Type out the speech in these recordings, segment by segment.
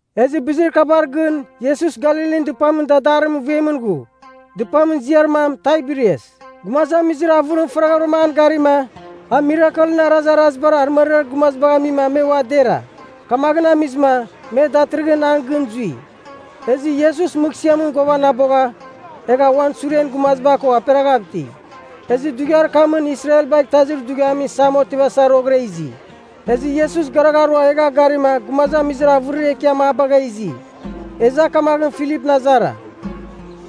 Ezɨ bizir kabar gɨn Iesus Galilin Dɨpamɨn dadarir vuemɨn ghu, dɨpamɨn ziar mam Taiberias. Gumazamizir avɨrim faraghavɨra an garima a mirakelɨn arazarazibar arɨmariar gumazibagh amima me ua dera. Kamaghɨn amizɨma me datɨrɨghɨn an gɨn zui. Ezɨ Iesus mɨghsɨamɨn ghuavanabogha, egha uan suren gumaziba ko aperaghav iti. Ezɨ dughiar kamɨn Israelbagh Itazir Dughiamɨn Isam otivasa roghɨra izi. Ezɨ Iesus garagharua egha garima gumazamizir avɨrir ekiam a bagha izi. Ezɨ a kamaghɨn Filipɨn azara,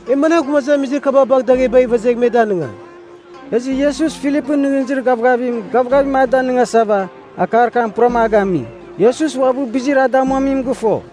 “E managh gumazamizir kaba bagh daghebagh ivezegh me danɨngam?” (Ezɨ Iesus Filipɨn nɨghnɨzir gavgavim, gavgavim a danɨngasava, akar kam puram a gami. Iesus uabɨ bizir a damuamim gɨfo.)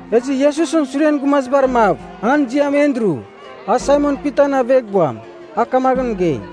Ezɨ Iesusɨn suren gumazibar mav, an ziam Andru, a Saimon Pitan aveghbuam, a kamaghɨn mɨgei,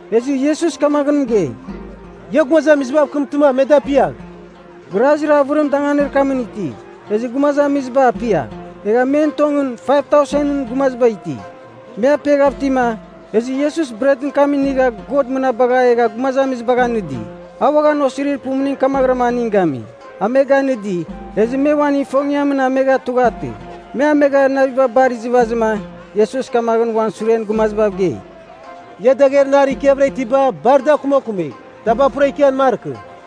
Ezɨ Iesus kamaghɨn mɨgei, “Ia gumazamizibav mɨkɨmtɨma me dapiagh.” (Grazir avɨrim danganir kamɨn iti.) Ezɨ gumazamiziba apia. Egha men tongɨn, 5000ɨn gumaziba iti. Me apiaghav itima, ezɨ Iesus bretɨn kam inigha God mɨnabagha egha gumazamizibagh anɨdi. A uaghan osirir pumuning kamaghɨra aning gami. A me ganɨdi, ezɨ me uan ifongiamɨn amegha tughatɨ. Me amegha naviba bar izɨvazɨma Iesus kamaghɨn uan suren gumazibav gei, “Ia dagher nar ikiavɨra itiba bar da akumakumigh. Taba pura ikian markɨ.”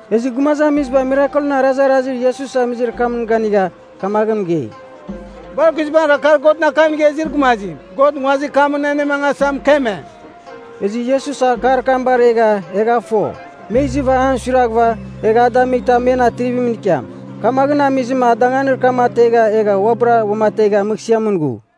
Ezɨ gumazamiziba mirakelɨn arazarazir Iesus amizir kamɨn ganigha, kamaghɨn mɨgei, “Bar guizbangɨra kar Godɨn akam inigha izir gumazim, God nguazir kamɨn anemangasa mɨkeme!” Ezɨ Iesus akar kam baregha egha a fo, me izɨva an suiraghɨva, egh a damightɨ a men atrivimɨn ikiam. Kamaghɨn amizɨma a danganir kam ategha egha uabɨra uamategha mɨghsɨamɨn ghu.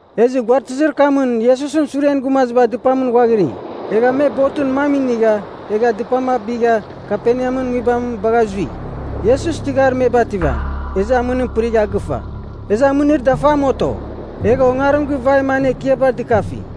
Ezɨ guaratɨzir kamɨn Iesusɨn suren gumaziba dɨpamɨn ghuaghiri. Egha me botɨn mam inigha egha dɨpam abigha Kaperneamɨn nguibam bagha zui. Iesus tɨghar me bativam, ezɨ amɨnim pɨrigha gɨfa. Ezɨ amɨnir dafam oto, egha ongarim givaima an ekiabar dɨkafi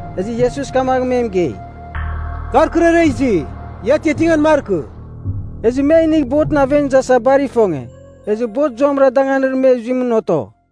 Ezɨ Iesus kamaghɨn me mɨgei “Kar kɨrara izi. Ia atiatingan markɨ.” Ezɨ me a inigh botɨn aven izasa bar ifonge, ezɨ bot zuamɨra danganim me zuimɨn oto.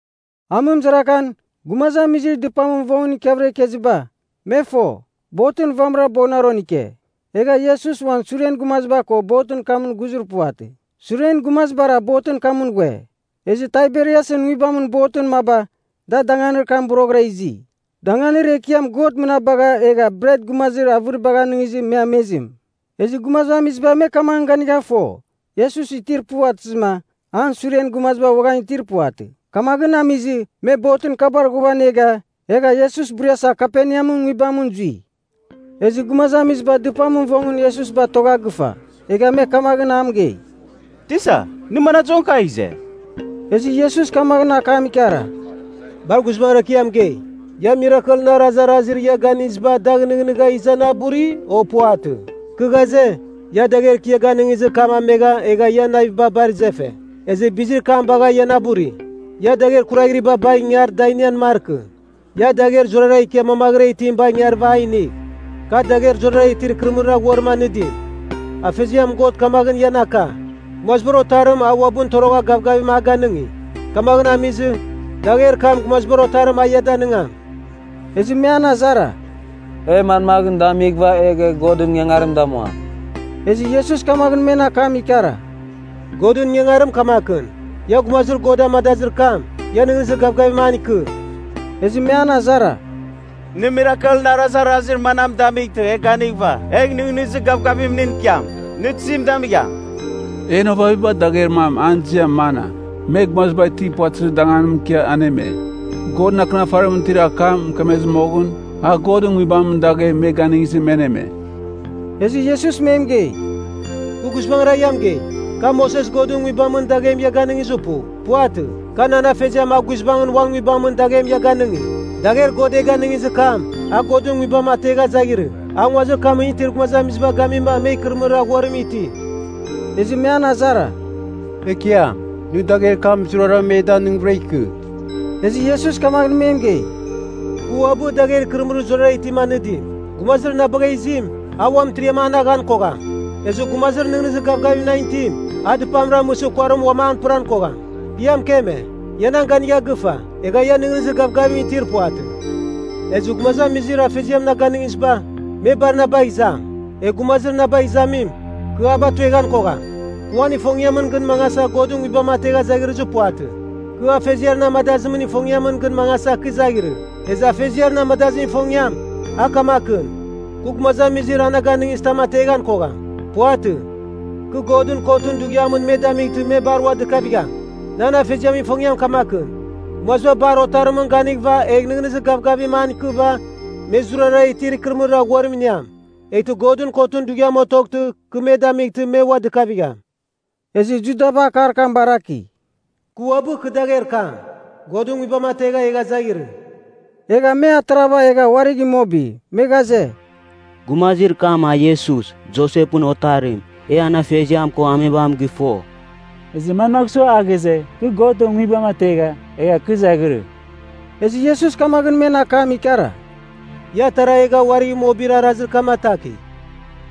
Amɨmɨzarakan, gumazamizir dɨpamɨn vongɨn ikiavɨra ikeziba, me fo, botɨn vamɨra boghɨnaron ike, egha Iesus uan suren gumaziba ko botɨn kamɨn ghuzir puvatɨ. Suren gumazibara botɨn kamɨn ghue. Ezɨ Taiberiasɨn nguibamɨn botɨn maba, da danganir kam boroghɨra izi, danganir Ekiam Godɨn mɨnabagha egha bret gumazir avɨribagh anɨngizɨ me amezim. Ezɨ gumazamiziba me kamaghɨn ganigha fo, Iesus itir puvatɨzɨma, an suren gumaziba uaghan itir puvatɨ. Kamaghɨn amizɨ, me botɨn kabar ghuavanega, egha Iesus buriasa Kaperneamɨn nguibamɨn zui. Ezɨ gumazamiziba dɨpamɨn vongɨn Iesus batogha gɨfa, egha me kamaghɨn a mɨgei, “Tisa, nɨ manadɨzoghɨn kagh ize?” Ezɨ Iesus kamaghɨn akam ikara, “Bar guizbangɨra kɨ ia mɨgei, ia mirakelɨn arazarazir ia ganiziba dagh nɨghnɨgha iza na buri, o? Puvatɨ. Kɨ ghaze, ia dagher kɨ ia ganɨngizir kam amegha egha ian naviba bar izefe, ezɨ bizir kam bagha ia na buri. Ia dagher kuraghriba bagh ingar da inian markɨ. Ia dagher zurara ikia mamaghɨra itim bagh ingarɨva a inigh, kar dagher zurara itir ikɨrɨmɨrir aghuarim anɨdim. Afeziam God kamaghɨn ian aka, Gumazibar Otarim, a uabɨn torogha gavgavim a ganɨngi. Kamaghɨn amizɨ, dagher kam, Gumazibar Otarim a ia danɨngam.” Ezɨ me an azara, “E manmaghɨn damighɨva egh e Godɨn ingangarim damuam?” Ezɨ Iesus kamaghɨn men akam ikara, “Godɨn ingangarim kamakɨn. Ia gumazir God amadazir kam, ia nɨghnɨzir gavgavim an ikɨ.” Ezɨ me an azara, “Nɨ mirakelɨn arazarazir manam damightɨ e ganighɨva egh nɨghnɨzir gavgavim nɨn ikiam? Nɨ tizim damigham? En ovaviba dagher mam an ziam mana, me gumaziba itir puvatɨzir danganimɨn ikia aneme. Godɨn Akɨnafarimɨn itir akam mɨkemezɨ moghɨn, ‘A Godɨn Nguibamɨn daghem me ganɨngizɨma me aneme.’” Ezɨ Iesus me mɨgei, “Kɨ guizbangɨra ia mɨgei, ka Moses Godɨn Nguibamɨn daghem ia ganɨngizir pu. Puvatɨ. Ka nan Afeziam a guizbangɨn Uan Nguibamɨn daghem ia ganɨngi. Dagher God e ganɨngizir kam, a Godɨn Nguibam ategha izaghirɨ, a nguazir kamɨn itir gumazamiziba gamima me ikɨrɨmɨrir aghuarim iti.” Ezɨ me an azara, “Ekiam, nɨ dagher kam zurara e danɨngvɨra ikɨ.” Ezɨ Iesus kamaghɨn me mɨgei, “Kɨ uabɨ, dagher ikɨrɨmɨrir zurara itim anɨdim. Gumazir na bagha izim, a ua mɨtiriam an aghan kogham. Ezɨ gumazir nɨghnɨzir gavgavim nan itim, a dɨpam ramɨsɨ kuarim uam an pɨran kogham. Kɨ ia mɨkeme, ia nan ganigha gɨfa, egha ia nɨghnɨzir gavgavim itir puvatɨ. Ezɨ gumazamizir Afeziam na ganɨngiziba, me bar na bagh izam. Egh gumazir na bagh izamim, kɨ a batueghan kogham. Kɨ uan ifongiamɨn gɨn mangasa Godɨn Nguibam ategha izaghirɨzir puvatɨ. Kɨ Afeziar na amadazimɨn ifongiamɨn gɨn mangasa kɨ izaghirɨ. Ezɨ Afeziar na amadazimɨn ifongiam, a kamakɨn, kɨ gumazamizir a na ganɨngizitam ateghan kogham. Puvatɨ. Kɨ Godɨn Kotɨn Dughiamɨn me damightɨ me bar ua dɨkavigham. Nan Afeziamɨn ifongiam kamakɨn, gumaziba bar Otarimɨn ganighɨva egh nɨghnɨzir gavgavim an ikɨva, me zurara itir ikɨrɨmɨrir aghuarim iniam. Eghtɨ Godɨn Kotɨn Dughiam otoghtɨ kɨ me damightɨ me ua dɨkavigham.” Ezɨ Judaba akar kam baraki, “Kɨ uabɨ kɨ dagher kam, Godɨn Nguibam ategha egha izaghirɨ,” egha me atarava egha uarigh imobi. Me ghaze, “Gumazir kam a Iesus, Josepɨn otarim. E an afeziam ko amebam gɨfo. Ezɨ manmagh sua a ghaze, ‘Kɨ Godɨn Nguibam ategha, egha kɨ zaghirɨ?’” Ezɨ Iesus kamaghɨn men akam ikara, “Ia atara egha uarigh imobir arazir kam atakigh.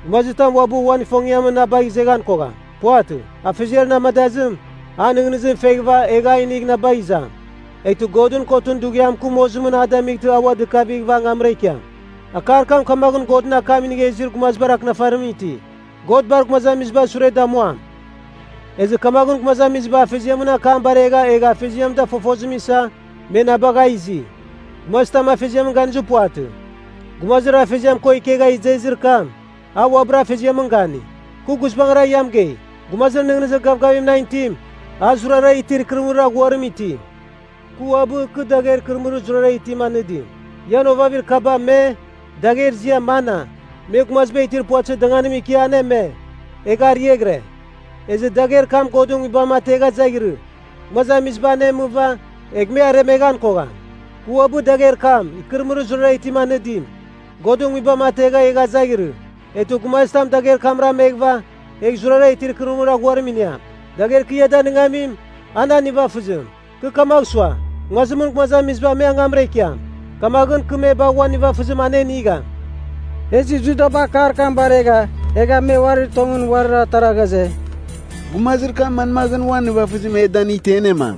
Gumazitam uabɨ uan ifongiamɨn na bagh izeghan kogham. Puvatɨ. Afeziar na amadazim, an nɨghnɨzim feghɨva egh a inigh na bagh izam. Eghtɨ Godɨn Kotɨn Dughiam kɨ mozimɨn a damightɨ a ua dɨkavighɨva angamra ikiam. Akar kam kamaghɨn Godɨn akam inigha izir gumazibar Akɨnafarimɨn iti, ‘God bar gumazamizibar sure damuam.’ Ezɨ kamaghɨn gumazamiziba Afeziamɨn akam baregha egha Afeziam da fofozim isa, me na bagha izi. “Gumazitam Afeziamɨn ganizir puvatɨ. Gumazir Afeziam ko ikegha izezir kam, a uabɨra Afeziamɨn gani. Kɨ guizbangɨra ia mɨgei, gumazir nɨghnɨzir gavgavim nan itim, a zurara itir ikɨrɨmɨrir aghuarim iti. Kɨ uabɨ, kɨ dagher ikɨrɨmɨrir zurara itim anɨdim. Ian ovavir kaba me, dagher ziam mana, me gumaziba itir puvatɨzir danganimɨn ikia aneme, egha ariaghɨre. Ezɨ dagher kam Godɨn Nguibam ategha izaghirɨ, gumazamiziba anemɨva, egh me aremeghan kogham. Kɨ uabɨ dagher kam, ikɨrɨmɨrir zurara itim anɨdim, Godɨn Nguibam ategha egha zaghirɨ. Eghtɨ gumazitam dagher kamra ameghɨva, a zurara itir ikɨrɨmɨrir aghuarim iniam. Dagher kɨ a danɨngamim, a nan nivafɨzim. Kɨ kamagh sua, nguazimɨn gumazamiziba me angamra ikiam, kamaghɨn kɨ me bagh uan nivafɨzim anenigham.” Ezɨ Judaba akar kam baregha egha me uari tongɨn uarir atara ghaze, “Gumazir kam manmaghɨn uan nivafɨzim e danightɨ e anemam?”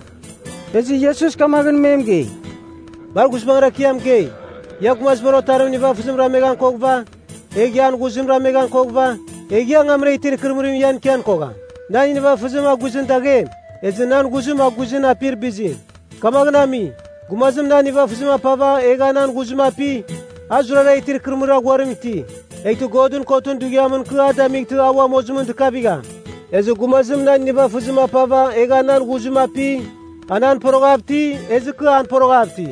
Ezɨ Iesus kamaghɨn me mɨgei, “Bar guizbangɨra kɨ ia mɨgei, ia Gumazibar Otarimɨn nivafɨzim rameghan koghɨva, egh an ghuzim rameghan koghɨva, egh ia angamra itir ikɨrɨmɨrim ian ikian kogham. Nan nivafɨzim a guizɨn daghem, ezɨ nan ghuzim a guizɨn apir bizim. Kamaghɨn ami, gumazim nan nivafɨzim apava egha nan ghuzim api, a zurara itir ikɨrɨmɨrir aghuarim iti. Eghtɨ Godɨn Kotɨn Dughiamɨn kɨ a damightɨ a ua mozimɨn dɨkavigham. Ezɨ gumazim nan nivafɨzim apava egha nan ghuzim api, a nan poroghav iti, ezɨ kɨ an poroghav iti.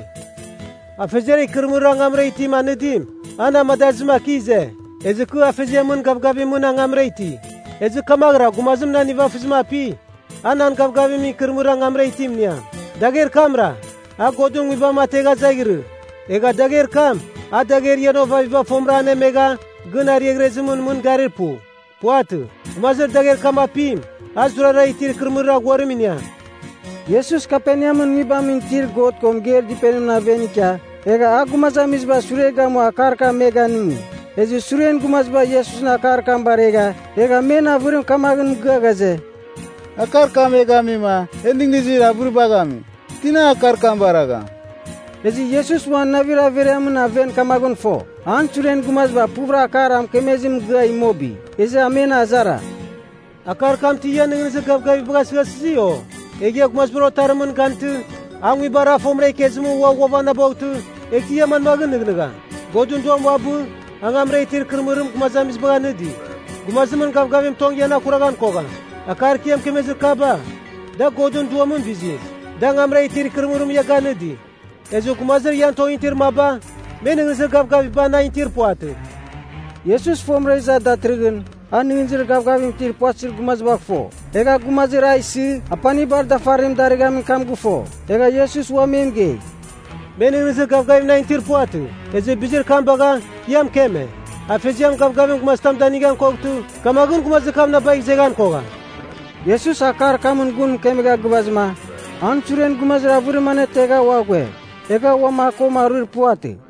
Afeziar ikɨrɨmɨrir angamra itim anɨdim, a na amadazɨma kɨ ize, ezɨ kɨ Afeziamɨn gavgavimɨn angamra iti. Ezɨ kamaghɨra gumazim nan nivafɨzim api, a nan gavgavimɨn ikɨrɨmɨrir angamra itim iniam. Dagher kamra, a Godɨn Nguibam ategha izaghirɨ. Egha dagher kam, a dagher ian ovaviba fomɨram anemegha gɨn ariaghrezimɨn mɨn garir pu. Puvatɨ. Gumazir dagher kam apim, a zurara itir ikɨrɨmɨrir aghuarim iniam.” Iesus Kaperneamɨn nguibamɨn itir God ko mɨgeir dɨpenimɨn aven ikia, egha a gumazamizibar sure gamua akar kam me ganɨngi. Ezɨ suren gumaziba Iesusɨn akar kam baregha, egha men avɨrim kamaghɨn mɨgɨa ghaze, “Akar kam e gamima e nɨghnɨzir avɨribagh ami. Tina akar kam baragham?” Ezɨ Iesus uan navir averiamɨn aven kamaghɨn fo, an suren gumaziba puvɨra akar a mɨkemezim mɨgɨa imobi. Ezɨ a men azara, “Akar kam ti ian nɨghnɨzir gavgaviba gasɨghasɨsi, o? Egh ia Gumazibar Otarimɨn ganightɨ, a nguibar a fomɨra ikezimɨn ua ghuavanaboghtɨ, eghtɨ ia manmaghɨn nɨghnɨgham? Godɨn Duam uabɨ, angamra itir ikɨrɨmɨrim gumazamizibagh anɨdi. Gumazimɨn gavgavim tong ian akuraghan kogham. Akar kɨ ia mɨkemezir kaba, da Godɨn Duamɨn bizim, da angamra itir ikɨrɨmɨrim ia ganɨdi. Ezɨ gumazir ian tongɨn itir maba, me nɨghnɨzir gavgaviba nan itir puvatɨ.” (Iesus fomɨra iza datɨrɨghɨn, a nɨghnɨzir gavgavim itir puvatɨzir gumazibagh fo. Egha a gumazir a isɨ apanibar dafarim darɨghamin kam gɨfo.) Egha Iesus ua me mɨgei, “Me nɨghnɨzir gavgavim nan itir puvatɨ, ezɨ bizir kam bagha, kɨ ia mɨkeme, ‘Afeziam gavgavim gumazitam danigan koghtɨ, kamaghɨn gumazir kam na bagh izeghan kogham.’” Iesus akar kamɨn gun mɨkemegha gɨvazɨma, an suren gumazir avɨrim anetegha ua ghue, egha uam a ko aruir puvatɨ.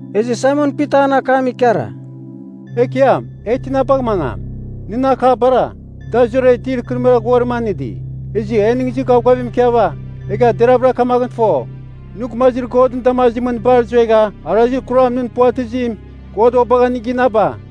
Ezɨ Saimon Pita an akam ikara, “Ekiam, e tina bagh mangam? Nɨn akabara, da zurara itir ikɨrɨmɨrir aghuarim anɨdi. Ezɨ e nɨghnɨzir gavgavim ikiava, egha deravɨra kamaghɨn fo, nɨ gumazir Godɨn damazimɨn bar zuegha arazir kuram nɨn puvatɨzim, God ua bagha nɨ ginaba.”